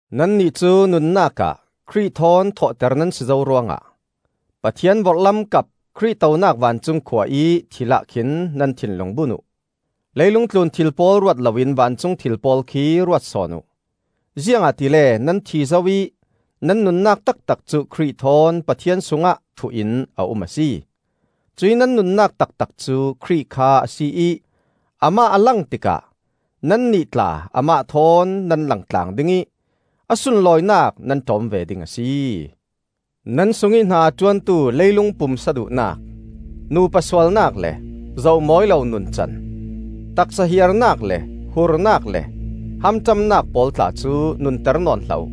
Nannih cu nunnak ah Khrih thawn thawhter nan si zo ruangah Pathian vorhlam kap Khrih tonak vancung khua ih thil ah khin nan thinlung bun uh. Leilung tlun thil pawl ruat loin vancung thil pawl khi ruat sawn uh. Ziangahtile nan thi zo ih nan nunnak taktak cu Khrih thawn Pathian sungah thuh-in a um a si. Cuih nan nunnak taktak cu Khrih kha a si ih amah a lang tikah nannih tla amah thawn nan langtlang ding ih a sunlawinak nan ṭawm ve ding a si. Nan sungih hna a ṭuantu leilung pumsa duhnak: nupa sualnak le zoh mawi lo nuncan, taksa hiarnak le hurnak le hamṭamnak pawl tla cu nunter nawn hlah uh.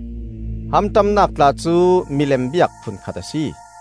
(Hamṭamnak tla cu milem biak phunkhat a si.)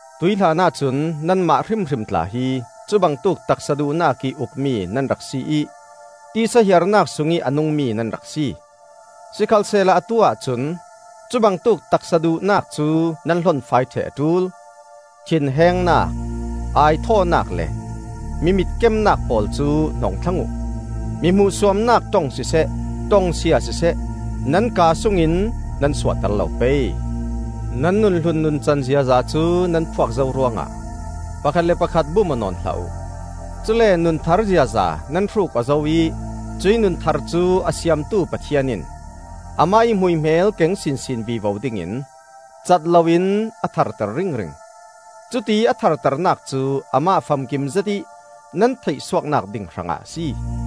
Tuih hlanah cun nanmah hrimhrim tla hi cubangtuk taksa duhnakih ukmi nan rak si ih tisa hiarnak sungih a nungmi nan rak si. Sikhalsehla atu-ah cun cubangtuk taksa duhnak cu nan hlonfai ṭheh a ṭul: thinhengnak, aithawhnak le mi mitkemnak pawl cu hnong thlang uh. Mi hmuhsuamnak ṭong siseh, ṭongsia siseh, nan kaa sungin nan suahter lo pei. Nan nun hlun nuncan ziaza cu nan phuak zo ruangah pakhat le pakhat bum aw nawn hlah uh; cule nun thar ziaza nan hruk aw zo ih cuih nun thar cu a siamtu Pathian in amah ih hmuihmel keng sinsin vivo dingin cat loin a tharter ringring. Cutiih a tharternak cu amah famkim zetih nan theihsuaknak ding hrangah a si.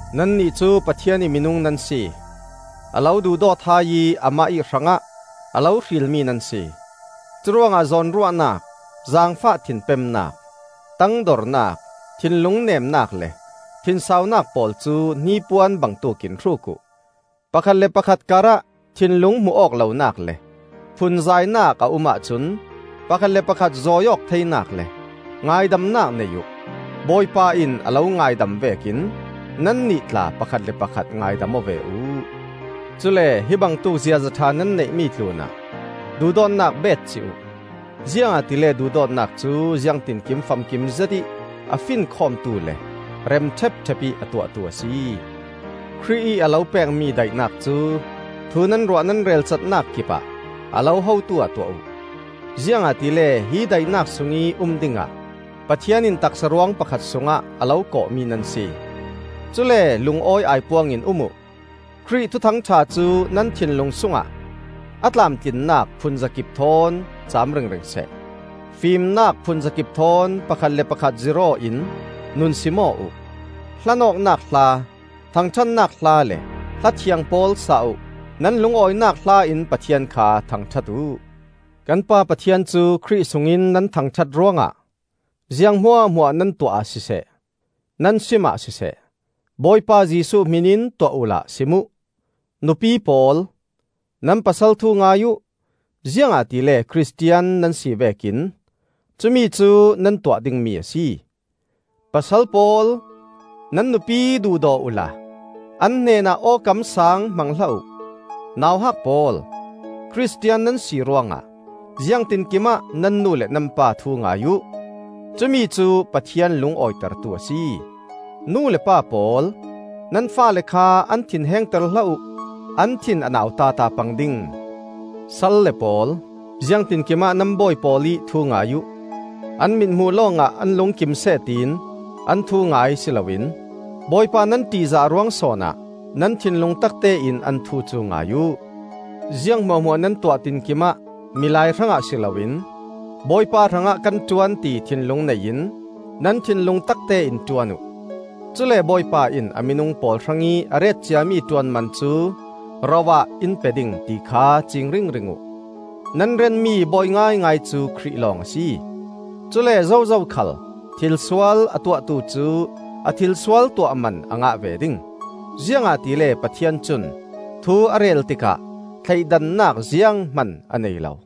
Nannih cu Pathian ih minung nan si; a lo duhdawt hai ih amah ih hrangah a lo hrilmi nan si. Curuangah zawnruahnak, zaangfah thinpemnak, tangdornak, thinlung nemnak le thinsaunak pawl cu hnipuan bangtuk in hruk uh. Pakhat le pakhat karah thinlung hmuh-awk lonak le phunzainak a um ahcun pakhat le pakhat zawi-awk theinak le ngaidamnak nei uh. Bawipa in a lo ngaidam vekin nannih tla pakhat le pakhat ngaidam aw ve uh. Cule hibangtuk ziaza ṭha nan neihmi tlunah duhdawtnak beetcih uh; ziangahtile duhdawtnak cu ziangtinkim famkim zetih a finkhawmtu le rem ṭhepṭhep ih a tuahtu a si. Khrih ih a lo pekmi daihnak cu thu nan ruah nan relcatnak kipah a lo hotu-ah tuah uh; ziangahtile hi daihnak sungih um dingah Pathian in taksa ruang pakhat sungah a lo kawhmi nan si. Cule lungawi aipuang in um uh. Khrih Thuthang ṭha cu nan thinlung sungah a tlamtlinnak phunzakip thawn cam ringring seh. Fimnak phunzakip thawn pakhat le pakhat zirh-aw in nunsim aw uh. Hlanawknak hla, thangṭhatnak hla le hla thiang pawl sa uh. Nan lungawinak hla in Pathian kha thangṭhat uh. Kan Pa Pathian cu Khrih sungin nan thangṭhat ruangah, ziang hmuahhmuah nan tuah ah siseh, nan simah siseh, Bawipa Jesuh hmin in tuah uhla sim uh. Nupi pawl, nan pasal thu ngai uh; ziangahtile Khristian nan si vekin cumicu nan tuah dingmi a si. Pasal pawl, nan nupi duhdaw uhla an hnenah awkam saang hmang hlah uh. Nauhak pawl, Khristian nan si ruangah ziangtinkim ah nan nu le nan pa thu ngai uh. Cumi cu Pathian lungawitertu a si. Nu le pa pawl, nan faale kha an thinhengter hlah uh; an thin a nau tata pang ding. Salle pawl, ziangtinkim ah nan bawi pawl ih thu ngai uh. An mithmuh lawngah an lungkim seh tiin an thu ngai si loin, Bawipa nan ṭihzah ruang sawn ah nan thinlung taktein an thu cu ngai uh. Ziang hmuahhmuah nan tuah tinkim ah milai hrangah si loin Bawipa hrangah kan ṭuan ti thinlung nei in nan thinlung taktein ṭuan uh. Cule Bawipa in a minung pawl hrangih a ret ciami ṭuanman cu ro ah in pe ding, ti kha ciing ringring uh. Nan rianmi Bawi ngaingai cu Khrih lawng a si. Cule zozo khal thilsual a tuahtu cu a thilsual tuahman a ngah ve ding; ziangahtile Pathian cun thu a rel tikah thleidannak zianghman a nei lo.